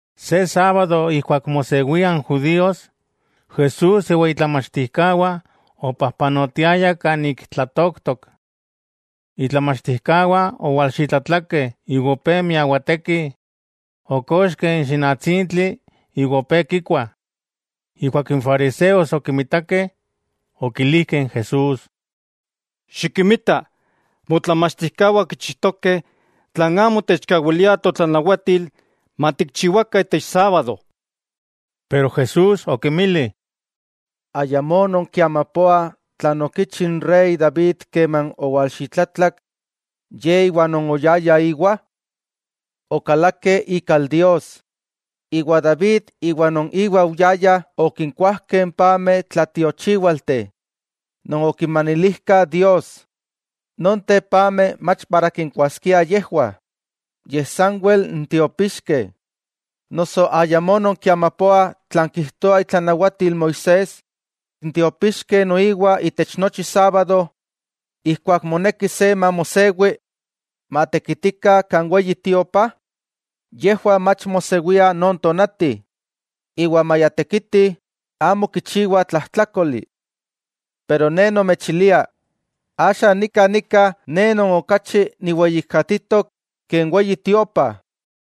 Se sábado ijkuak mosewia n judíos, Jesús iwa itlamachtijkawah opajpanotiayah kan ik tlatooktok. Itlamachtijkawah owalxitlatlakeh iwa opé miawatekih, okoxkeh n xinatsintli iwa opé kikuah. Ijkuak n fariseos okimitakeh, okilijkeh n Jesús: —Xikinmita, motlamachtijkawah kichijtokeh tlan amo techkawilia totlanawatil matikchiwakah itech sábado. Pero Jesús okinmili: —¿Ayamó nonkiamapoah tlan okichi n rey David keman owalxitlatlak ye iwa non oyayah íwa? Okalakeh ikal Dios, iwa David iwa non iwa oyayah okinkuajkeh n pameh tlatiochíwalteh non okinmanilijkah Dios. Nonteh pameh mach para kinkuaskia yejwah, yej sanwel n tiopixkeh. ¿Noso ayamó nonkiamapoah tlan kijtoa itlanawatil Moisés, n tiopixkeh noiwa itech nochi sábado ijkuak moneki se mamosewi, tekitih kan Weyi Tiopa? Yejwah mach mosewiah non tonati, iwa maya tekitih, amo kichiwah tlajtlákoli. Pero Ne nomechilia, axa nika nika Ne Non okachi niweyijkatitok ke n Weyi Tiopa.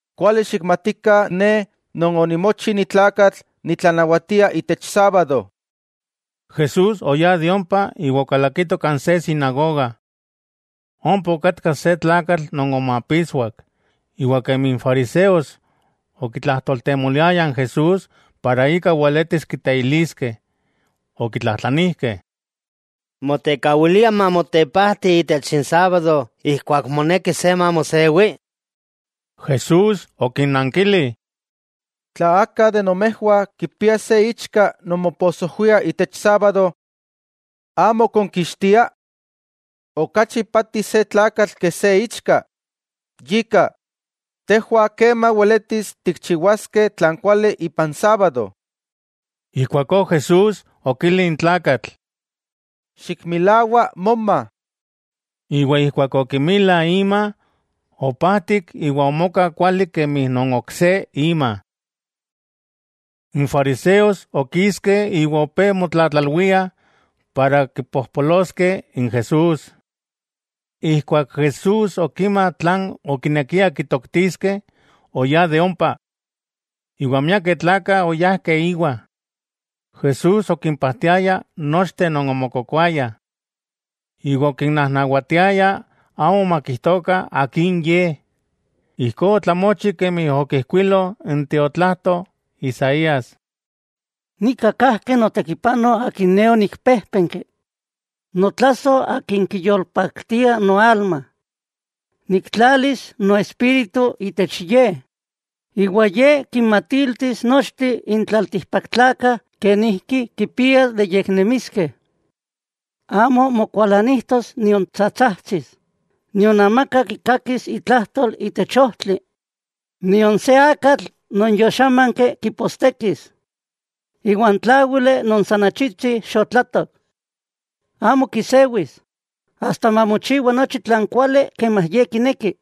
Kuali xikmatikah Ne Non onimochi ni tlakatl nitlanawatia itech sábado. Jesús oyá de ompa iwa okalakito kan se sinagoga. Ompa okatka se tlakatl non omapitswak, iwa kemi n fariseos okitlajtoltemoliayah n Jesús para ika weletis kiteiliskeh, okitlajtlanijkeh: —¿Motekawilia mamotepajti itech n sábado ijkuak moneki se mamosewi? Jesús okinnankili: —Tla aka de nomejwah kipia se ichka non moposojwia itech sábado, ¿amo konkixtia? ¡Okachi ipati se tlakatl ke se ichka! Yika, tejwah kema weletis tikchiwaskeh tlan kuali ipan sábado. Ijkuakó Jesús okili n tlakatl: —Xikmilawa moma. Iwa ijkuak okimila ima, opajtik iwa omoka kuali kemi non ok se ima. N fariseos okiskeh iwa opé motlatlalwiah para kipojpoloskeh n Jesús. Ijkuak Jesús okima tlan okinekiah kitoktiskeh, oyá de ompa, iwa miakeh tlakah oyajkeh íwa. Jesús okimpajtiaya nochteh non omokokoayah, iwa okinnajnawatiaya amo makijtokah Akin Ye. Ijkó otlamochi kemi okijkuilo n tiotlajto Isaías: Nika kajki notékipano Akin Ne onikpéjpenki, notlasoj Akin kiyolpaktia noalma. Niktlalis Noespíritu itech Ye, iwa Ye kinmatiltis nochteh n tlaltikpaktlakah kenijki kipiah de yeknemiskeh. Amo mokualanijtos nion tsatsajtsis, nion amaka kikakis itlajtol itech ojtli. Nion se akatl non yoxámanki kipostekis, iwa n tláwili non san achitsi xotlatok, amo kisewis, asta mamochiwa nochi tlan kuali kemi Ye kineki.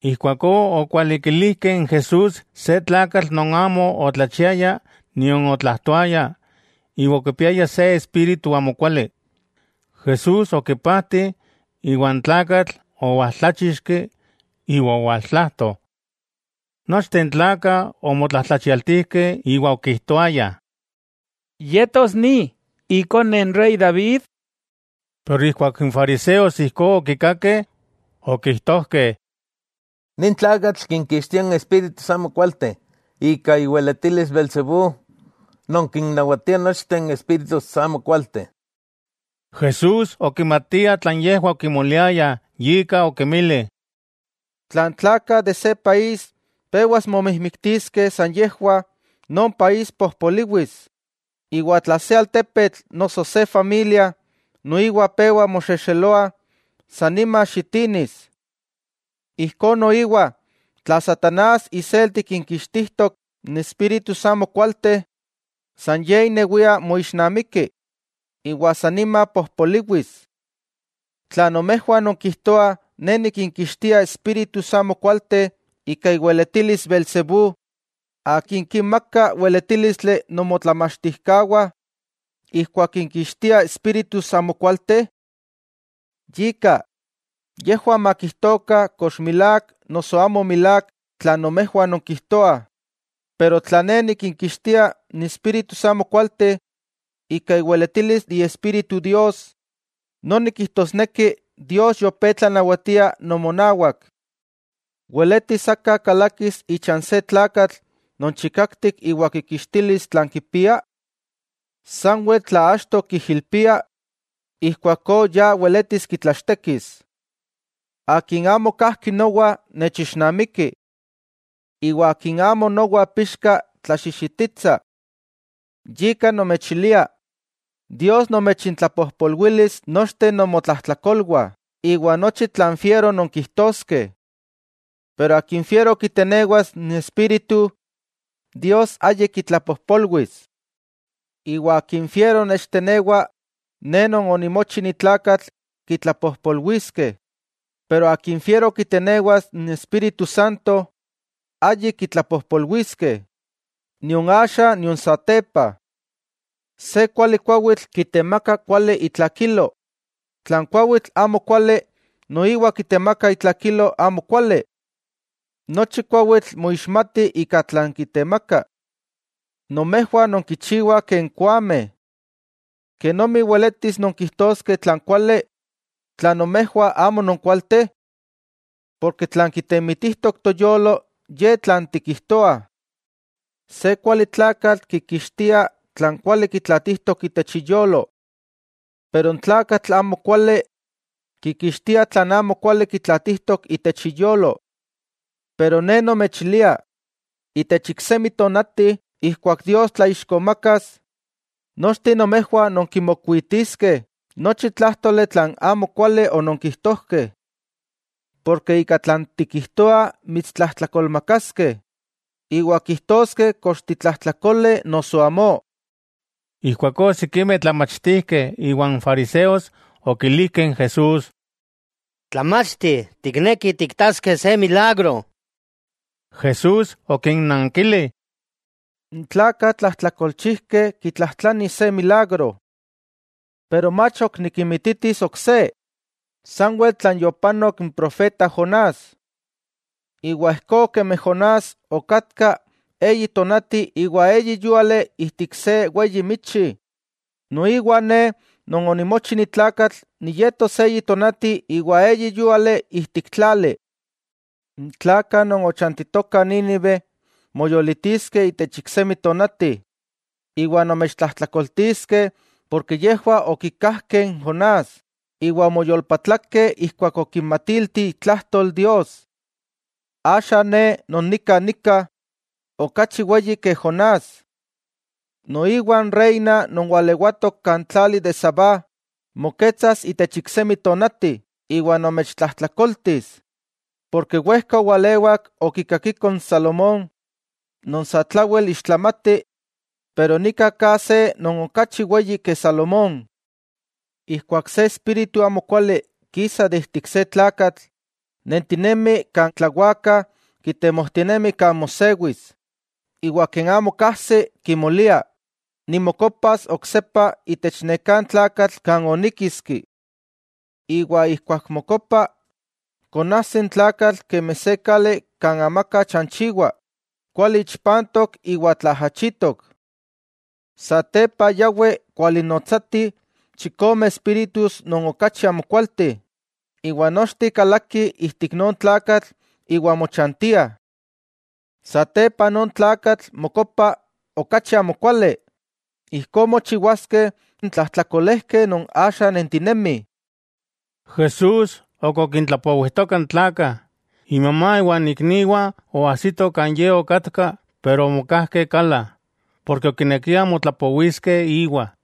Ijkuakó okwalikilijkeh n Jesús se tlakatl non amo otlachiaya nion otlajtoaya iwa okipiaya se espíritu amokuali. Jesús okipajti, iwa n tlakatl owaltláchixki iwa owaltlajto. Nochteh n tlakah omotlajtlachialtijkeh iwa okijtoayah: —¿Yetos ni, ikone n rey David? Keman n fariseos ijkó okikakeh, okijtojkeh: —Nin tlakatl kinkixtia n espíritus amokualteh ika iweletilis beelzebú, non kinnawatia n espíritus amokualteh. Jesús okimatia tlan yejwah okimoliayah, yika okinmili: —Tla n tlakah de se país pewas momijmiktiskeh san yejwah, non país pojpoliwis. Iwa tla se altepetl noso se familia noiwa pewa moxexeloa, sa nima xitinis. Ijkó noiwa, tla satanás iselti kinkixtijtok n espíritus amokualteh, san ye inewia moixnamiki iwa san nima pojpoliwis. Tla nomejwah nonkijtoah Ne nikinkixtia espíritus amokualteh ika iweletilis beelzebú, ¿akin kinmaka weletílistli nomotlamachtijkawah ijkuak kinkixtiah espíritus amokualteh? Yika, yejwah makijtokah kox milák noso amo milák tlan nomejwah nonkijtoah. Pero tla Ne nikinkixtia n espíritus amokualteh ika iweletilis Iespíritu Dios, noni kijtosneki Dios yopé tlanawatia nomonawak. '¿Weletis aka kalakis icha n se tlakatl non chikaktik iwa kikixtilis tlan kipia? Sanwel tla achto kijilpia, ijkuakó ya weletis kitlachtekis. 'Akin amo kajki nowa, nechixnamiki. Iwa akin amo nowa pixka, tlaxixititsa. 'Yika nomechilia, Dios nomechintlapojpolwilis nochteh nomotlajtlakolwah iwa nochi tlan fiero nonkijtoskeh. Pero akin fiero kitenewas n Espíritu, Dios ayik kitlapojpolwis. Iwa akin fiero nechtenewa Ne Non onimochi ni tlakatl, kitlapojpolwiskeh, pero akin fiero kitenewas n Espíritu Santo, ayik kitlapojpolwiskeh, nion axa, nion satepa. 'Se kuali kuawitl kitemaka kuali itlakilo, tla n kuawitl amo kuali, noiwa kitemaka itlakilo amo kuali. Nochi kuawitl moixmati ika tlan kitemaka. ¡Nomejwah nonkichiwah ken koameh! ¿Kenomi weletis nonkijtoskeh tlan kuali, tla nomejwah amo non kualteh? Porke tlan kitemitijtok toyolo ye tlan tikijtoah. Se kuali tlakatl kikixtia tlan kuali kitlaatitok itech iyolo. Pero n tlakatl amo kuali, kikixtia tlan amo kuali kitlaatitok itech iyolo. Ne nomechilia, itech iksemi tonati, ijkuak Dios tlaixkomakas, nochteh nomejwah nonkimokuitiskeh nochi tlájtoli tlan amo kuali ononkijtojkeh. Porke ika tlan tikijtoa mitstlajtlakolmakaskeh, iwa kijtoskeh kox titlajtlakole noso amó. Ijkuakó sikimeh tlamachtijkeh iwa n fariseos okilijkeh n Jesús: —Tlamachti, tiknekih tikitaskeh se milagro. Jesús okinnankili: —N tlakah tlajtlakolchijkeh kitlajtlanih se milagro. Pero mach ok nikinmititis ok se, sanwel tlan yopanok n profeta Jonás. Iwa ijkó kemi Jonás okatka eyi tonati iwa eyi yúali ijtik se weyi michi, noiwa Ne Non onimochi ni tlakatl, niyetos eyi tonati iwa eyi yúali ijtik tlali. N tlakah non ochantitokah Nínive moyolitiskeh itech iksemi tonati, iwa nomechtlajtlakoltiskeh porke yejwah okikajkeh n Jonás iwa omoyolpatlakeh ijkuak okinmatilti itlajtol Dios. Axa Ne Non nika nika, okachi weyi ke Jonás. Noiwa n reina non walewatok kan tlali de Sabá moketsas itech iksemi tonati iwa nomechtlajtlakoltis, porke wejka owalewak okikakiko n Salomón, non satlawel ixtlamati, pero nika ka se non okachi weyi ke Salomón. 'Ijkuak se espíritu amokuali kisa ijtik se tlakatl, nentinemi kan tlawakah kitemojtinemi kan mosewis, iwa ken amo kajsi kimolia: “Nimokopas oksepa itech neká tlakatl kan oníkiski.” Iwa ijkuak mokopa, konajsi n tlakatl kemi se kali kan amaka chanchiwa, kuali ichpantok iwa tlaajachitok. Satepa yawi kualinnotsati chikome espíritus non okachi amokualteh, iwa nochteh kalakih ijtik non tlakatl iwa mochantiah. Satepa non tlakatl mokopa okachi amokuali. Ijkó mochiwaskeh n tlajtlakolejkeh non axa nentinemih. Jesús ok okintlapowijtoka n tlakah, imamá iwan ikniwah oajsito kan Ye okatka pero omokajkeh kala, porke okinekiah motlapowiskeh íwa.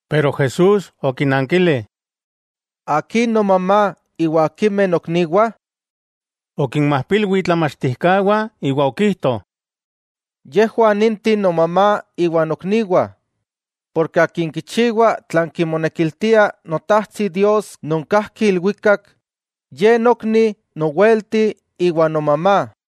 Pero Jesús okinankili: —¿Akin nomamá, iwa akimeh nokniwah? Okinmajpilwi itlamachtijkawah iwa okijto: —Yejwah ninteh nomamá iwa nokniwah. Akin kichiwa tlan kimonekiltia Notajtsi Dios non kajki ilwikak, ye nokni, nowelti iwa nomamá.